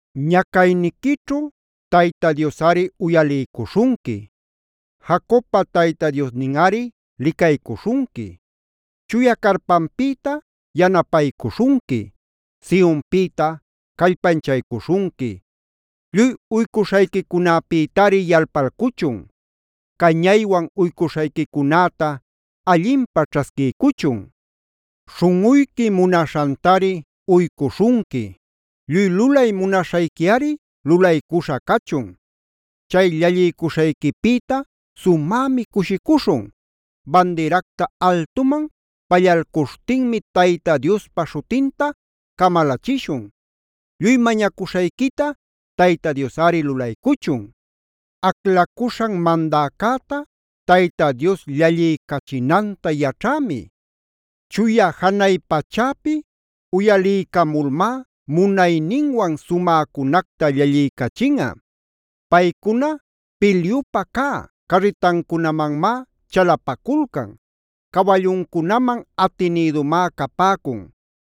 Ñacayniquićhu Tayta Diosꞌari uyaliycuśhunqui. Jacobpa Tayta Diosninꞌari licaycuśhunqui. Chuya carpanpïta yanapaycuśhunqui. Sionpïta callpanchaycuśhunqui. Lluy uycuśhayquicunäpïtari yalpalcuchun. Cañaywan uycuśhayquicunäta allinpä ćhasquiycuchun. Śhunꞌuyqui munaśhantari uycuśhunqui. Lluy lulay munaśhayquiꞌari lulaycuśha cachun. Chay llalliycuśhayquipïta sumämi cushicuśhun. Bandiracta altuman pallalcuśhtinmi Tayta Diospa śhutinta camalachishun. Lluy mañacuśhayquita Tayta Diosꞌari lulaycuchun. Aclacuśhan mandäcäta Tayta Dios llalliycachinanta yaćhämi. Chuya janay pachäpi uyaliycamulmá munayninwan sumäcunacta llalliycachinꞌa. Paycuna pilyupä cä carritancunamanmá chalapaculcan. Cawalluncunaman atinïdumá capäcun.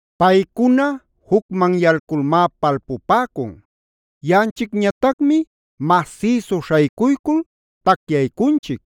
Paycuna jucmanyalculmá palpupäcun. Yaꞌanchicñatacmi masïsu śhaycuycul tacyaycunchic.